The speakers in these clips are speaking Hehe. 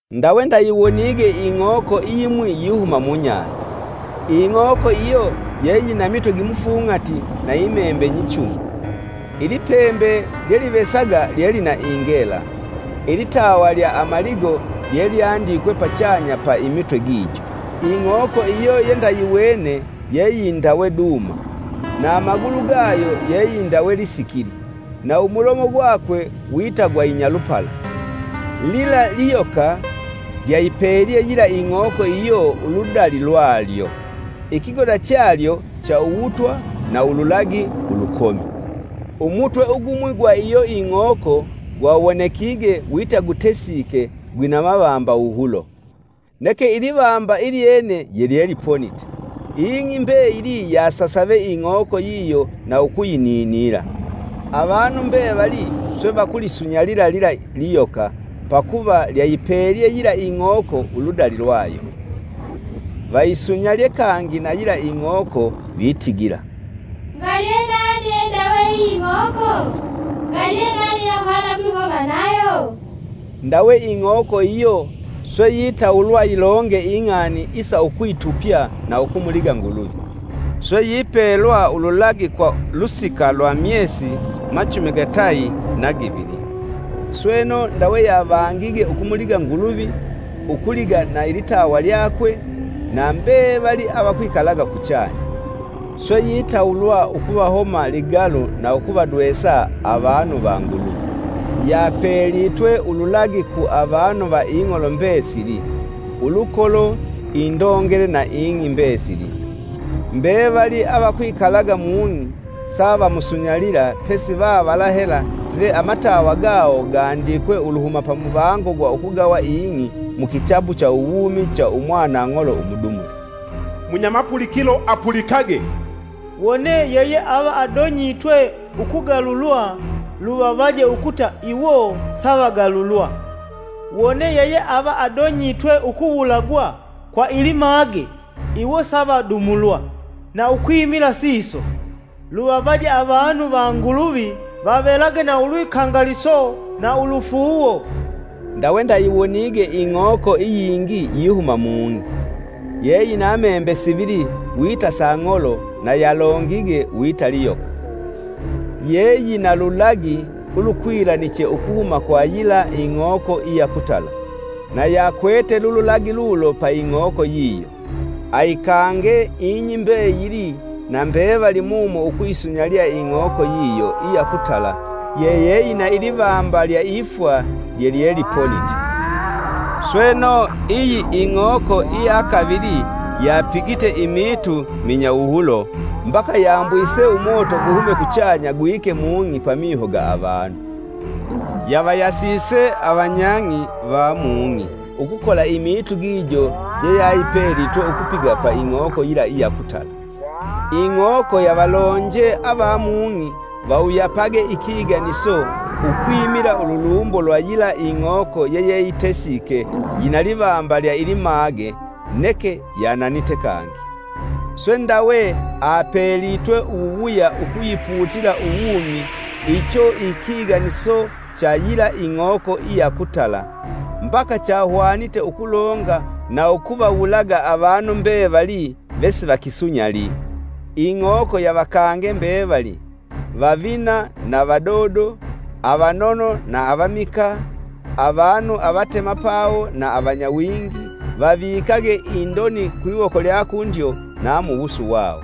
Ndawe ndayiwonige ing'oko iyimwi yihuma mubahali. Ing'oko iyo yeyina mitwe gimufung'ati na imembe nyichumi, ilipembe lyelivesaga lyelina ingela. Ilitawa lya amaligo lyelyandikwe pachanya pa imitwe gijo. Ing'oko iyo yendayiwene yeyindawe duma, na amagulu gayo yeyindawe lisikili, na umulomo gwakwe wita gwa Inyalupala. Lila liyoka lyayipelye yila ing'oko iyo uludali lyalyo; ikigoda chalyo cha uwutwa na ululagi ulukomi. Umutwe ugumwi gwa iyo ing'oko gwawonekige wita gutesike gwina mavamba wuhulo, neke ilivamba ilyene yelyeliponite. Ing'i mbeyili yasasave ing'oko yiyo na ukuyininila. Avanu mbevali swe vakulisunyalila lila liyoka pakuva lyayipelye yila Ing'oko uludali lwayo. Vayisunyalye kangi na yila ing'oko vitigila, “Ngali ye nami yeindawe iyi ing'oko? Ngali yenani yeahwana ukwihoma nayo?” Ndawe ing'oko iyo swe yitawulwa yilonge ing'ani isa ukwitupya na ukumuliga Nguluvi; swe yipelwa ululagi kwa lusika lwa myesi machumi gatayi na givili. Sweno, ndawe yavangige, ukumuliga Nguluvi, ukuliga na ilitawa lyakwe, na mbevali avikwikalaga kuchanya. Swe yitawulwa ukuvahoma ligalu na ukuvadwesa avanu va Nguluvi. Yapelitwe ululagi ku avanu va ing'olo mbesili, ulukolo, indongele na ing'i mbesili. Mbevali avakwikalaga mung'i savamusunyalila pesi vavala hela ve amatawa gawo gandikwe uluhuma pamuvango gwa ukugawa ing'i mukitabu cha uwumi cha umwanang'olo umudumule. “Munyamapulikilo, apulikage! Wone ave vadonyitwe ukugalulwa luvavaje ukuta iwo savagalulwa; wone vadonyitwe ukuwulagwa kwa ilimage iwo savadumulwa na ukwimila siso, luvavaje avanu va Nguluvi vavelage na ulwikangaliso na ulufuuwo.” Ndawe ndayiwonige ing'oko iyingi yihuma mung'i. Yeyina membe sivili wita sa ng'olo, na yalongige wita liyoka. Yeyina lulagi ulukwilaniche ukuhuma kwa yila ing'oko iya kutala, na yakwete lululagi lulo pa ing'oko yiyo. Ayikange ing'i mbeyili na mbevali mumo ukuyisunyalila ing'oko yiyo iya kutala yeyina ilivamba lya ifwa lyelyeliponite. Sweno, iyi ing'oko iya kavili yapigite imiitu minyawuhulo mbaka yambwise umoto guhume kuchanya gwike mung'i pamiho ga avanu. Yavayasise avanyang'i va mung'i ukukola imiitu gijo jeyapelitwe ukupiga pa ing'oko yila iya ukutala. Ing'oko yavalonje ava mung'i vawuyapage ikiganiso ukwimila ululumbo lwa yila ing'oko yeyeyitesike yina livamba lya ilimage neke yananite kangi. Swe ndawe apelitwe uwuwuya ukuyiputila uwumi icho ikiganiso cha yila ing'oko iya ukutala, mbaka chahwanite ukulonga na ukuvawulaga avanu mbevali vesivakisunyali. Ing'oko yavakange mbevali, vavina na vadodo, avanono na avamikaa, avanu avatemapawo na avanyawingi, vavavikage indoni kwiwoko lya kundyo na muwusu wawo.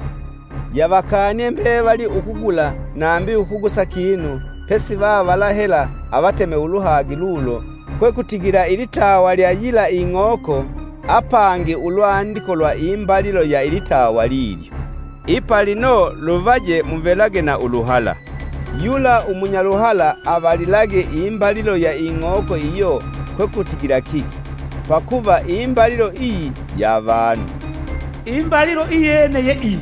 Yavakanie mbevali ukugula nambi ukugusa kinu pesi vavala hela avateme uluhagi lulo, kwekutigila ilitawa lya yila ing'oko apangi ulwandiko lwa imbalilo ya ilitawa lilyo. Ipa lino luvaje muvelage na uluhala, yula umunyaluhala avalilage imbalilo ya ing'oko iyo kwekutigila kiki, pakuva imbalilo iyi ya vanu, imbalilo iyene ye iyi,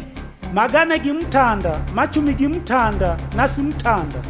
magana gimutanda, machumi gimutanda na simutanda.